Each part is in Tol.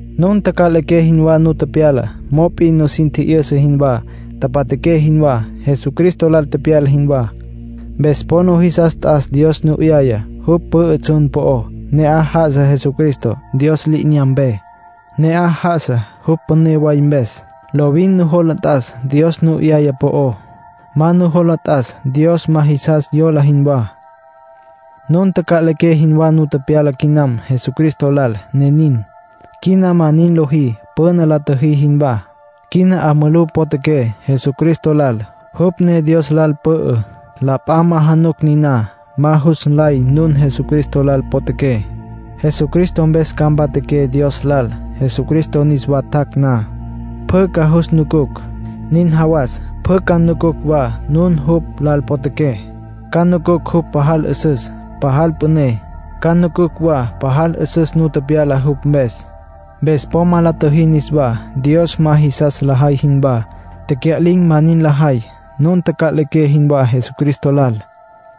Nun taca'liqué jinwá nu tepyala, mop'in nusin tjijyünsa jinwá, tapatjaqué jinwá, Jesucristo lal tepyala jinwá. Mpes po nujisas t'as Dios nu 'yayá. Jupj pü'ü tsjun po'ó. Ne'aj já'asa Jesucristo, Dios li'inyampe. Ne'aj já'asa, jupj püné way mpes. Lovin nujola t'as Dios nu 'yaya po'ó. Ma nujola t'as Dios ma jisas yola jinwá. Nun taca'liqué jinwá nu tepyala quinam Jesucristo lal, ne nin. Quina ma nin lojí püna la tjüjí jinwá. Quina 'a mulú potjaqué Jesucristo lal, jupj ne Dios lal pü'ü. La p'a ma januc niná, ma jus nlay nun Jesucristo lal potjaqué. Jesucristo mpes ca mpatjaqué Dios lal. Jesucristo niswa tjac' na, pjü ca jus nucucj. Nin jawas, pjü ca nucucj wa nun jupj lal potjaqué. Ca nucucj jupj pajal 'üsüs, pajal püné; ca nucucj wa pajal 'üsüs nu tepyala jupj mpes. Mpes po ma la tjüjí niswá, Dios ma jisas lajay jinwá. Tecya'lin̈ ma nin lajay. Nun taca'liqué jinwá Jesucristo lal.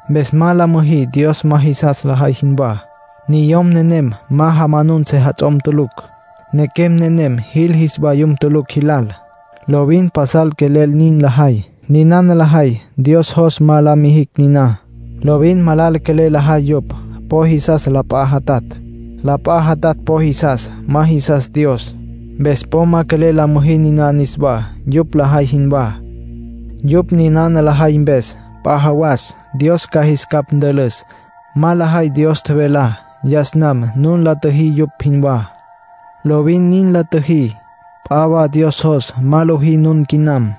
Mpes ma la müjí Dios ma jisas lajay jinwá. Niyom nenem jamanun sejats'om tulucj. Nequem nenem jil jis vayum tulucj jilal. Lovin pasal quelel nin lajay. Ninana lajay Dios jos ma la mijicj niná. Lovin malala quelel lajay yupj. Po jisas la p'a jatatj. La p'a jatatj po jisas; ma jisas Dios. Mpes po ma quelel la müjí niná niswá, yupj lajay jinwá. Yupj ninana lajay mpes, p'a jawas Dios ca jis capj ntülüs. Ma lajay Dios tjevelá. Yas nam nun la tjüjí yupj jinwá. Lovin nin la tjüjí. P'a wa Dios jos ma lojí nun quinam.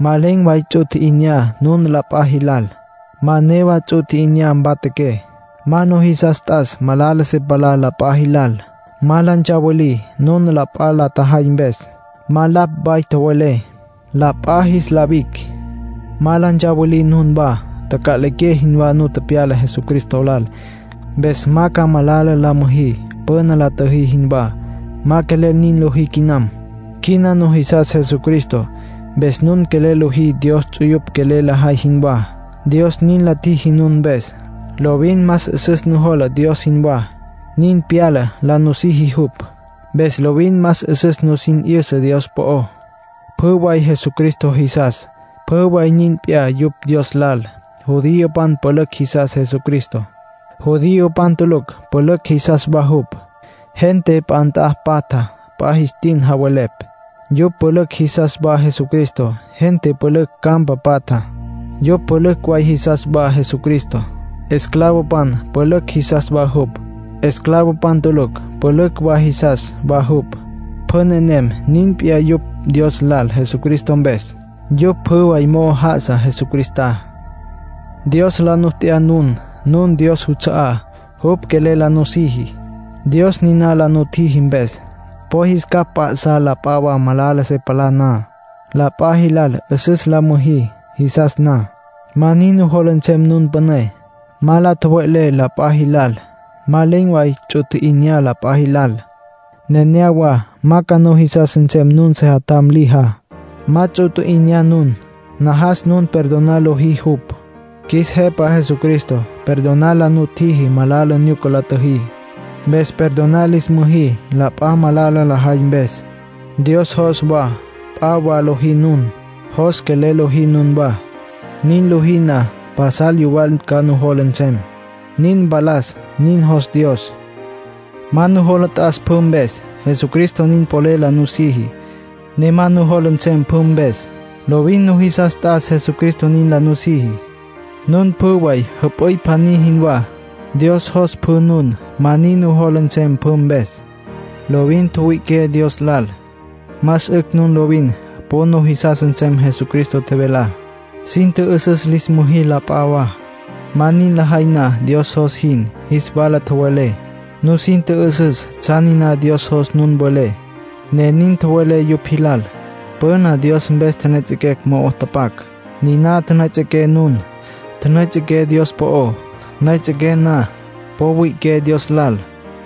Ma len̈ way ts'u tji'inyá nun la p'a jilal. Ma newa ts'u tji'inyá mpatjaqué. Ma nujisas t'as malala se palá la p'a jilal. Ma la ntsawilí nun la p'a la tjajay mpes. Ma lapj way tjowelé, la p'a jis la wic'. Ma la ntsawilí nunwá. Taca'liqué jinwá nu tepyala Jesucristo lal, mpes ma ca malala la müjí püna la tjüjí jinwá. Ma quelel nin lojí quinam. Quina nujisas Jesucristo. Mpes nun quelel lojí Dios ts'uyupj quelel lajay jinwá. Dios nin la tjiji nun mpes. Lovin más 'üsüs nujola Dios jinwá, nin pyala, la nusiji jupj. Mpes lovin más 'üsüs nusin 'yüsa Dios po'ó. Pjü way Jesucristo jisas, pjü way nin p'iyá yupj Dios lal. Judiopan pülücj jisas Jesucristo. Judiopan tulucj pülücj jisas wa jupj. Gente p'a nt'a patja, p'a jis tin javelepj. Yupj pülücj jisas wa Jesucristo. Gente pülücj campa patja. Yupj pülücj way jisas wa Jesucristo. Esclavopan pülücj jisas wa jupj. Esclavopan tulucj pülücj wa jisas wa jupj. Pjü nenem nin p'iyá yupj Dios lal Jesucristo mpes. Yupj pjü way mo'ó já'asa Jesucristá. Dios la nu t'ya nun. Nun Dios juts'a'á. Jupj quelel la nusiji. Dios niná la nutjiji mpes, po jis capj mp'a'sá la p'a wa, malala se palá na. La p'a jilal 'üsüs la müjí, jisas na. Ma nin nujola nsem nun püné. Ma la tjowe'lé la p'a jilal. Ma len̈ way ts'u tji'inyá la p'a jilal. Nenéyawa ma ca nujisas nsem nun sejatjam lijá. Ma ts'u tji'inyá nun. Najas nun perdonar lojí jupj. Qjuis Jepa Jesucristo perdonar la nutjiji malala nyuca la tjüjí. Mpes perdonar lis müjí la p'a, malala lajay mpes. Dios jos wa p'a wa lojí nun. Jos quelel lojí nunwá. Nin lojí na, pasal yuwal ca nujola nsem, nin mpalas. Nin jos Dios. Ma nujola t'as pjü mpes. Jesucristo nin polel la nusiji, ne ma nujola nsem pjü mpes. Lovin nujisas t'as Jesucristo nin la nusiji. Nun pjü way jüp'üy pjaní jinwá. Dios jos pjü nun ma nin nujola nsem pjü mpes. Lovin tjüwüi'iqué Dios lal. Más 'ücj nun lovin po nujisas nsem Jesucristo tjevelá. Sin tjü'üsüs lis müjí la p'a wa. Ma nin lajay na Dios jos jin, jis wala tjowelé. Nusin tjü'üsüs tsjan niná Dios jos nun welé, ne nin tjowelé yupj jilal. Püna Dios mpes tjenejets'en̈ mo'o tapac, niná tjünüejets'equé nun. Tjünüejets'equé Dios po'ó. Nüejets'equé na, po wüi'iqué Dios lal.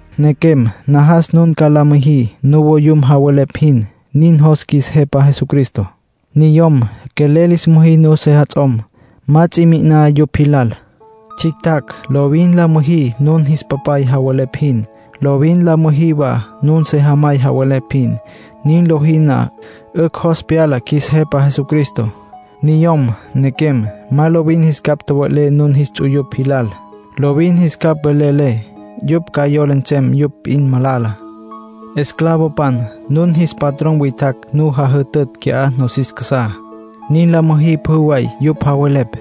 Nequem, najas nun ca nin la müjí nuvoyum javelepj jin. Nin jos qjuis Jepa Jesucristo. Niyom, quelel lis müjí nun sejats'om. Ma ts'i mi'iná yupj jilal. Tsjictjacj, lovin la müjí nun jis papay javelepj jin. Lovin la müjí wa nun sejamay javelepj jin. Nin lojí na, 'ücj jos pyala qjuis Jepa Jesucristo. Niyom, nequem, ma lovin jis capj tjowe'lé nun jis ts'uyupj jilal. Lovin jis capj velelé, yupj ca yola nsem yupj p'in malala. Esclavopan, nun jis patrón witjacj nu jajütütj qui'á, nosis casá. Nin la müjí pjü way yupj javelepj.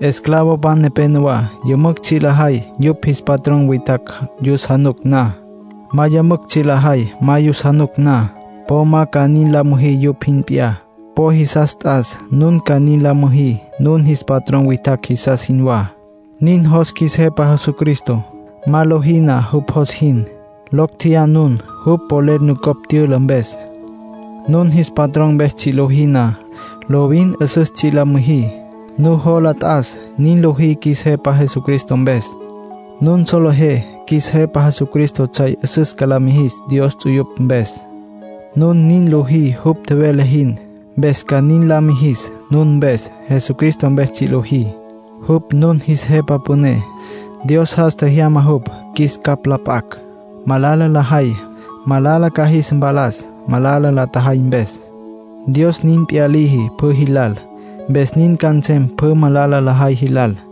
Esclavopan nepénowa yümücj tsji' lajay yupj jis patrón witjacj yus januc na. Ma yümücj tsji' lajay ma yus januc na. Po ma ca nin la müjí yupj jin p'iyá. Po jisas t'as nun ca nin la müjí nun jis patrón witjacj jisas jinwá. Nin jos qjuis Jepa Jesucristo. Ma lojí na jupj jos jin, locj tjeyá nun jupj polel nucopj tyüla mpes. Nun jis patrón mpes tsji' lojí na, lovin 'üsüs tsji' la müjí. Nujola t'as nin lojí qjuis Jepa Jesucristo mpes. Nun solejé qjuis Jepa Jesucristo tsjay 'üsüs ca la mijis Dios ts'uyupj mpes. Nun nin lojí jupj tjevele jin, mpes ca nin la mijis nun mpes. Jesucristo mpes tsji' lojí. Jupj nun jis Jepa Püné; Dios jas tjejyama jupj, qjuis capj la p'acj. Malala lajay, malala ca jis mpalas, malala la tjajay mpes. Dios nin p'iyá liji pjü jilal, mpes nin ca nsem pjü malala lajay jilal.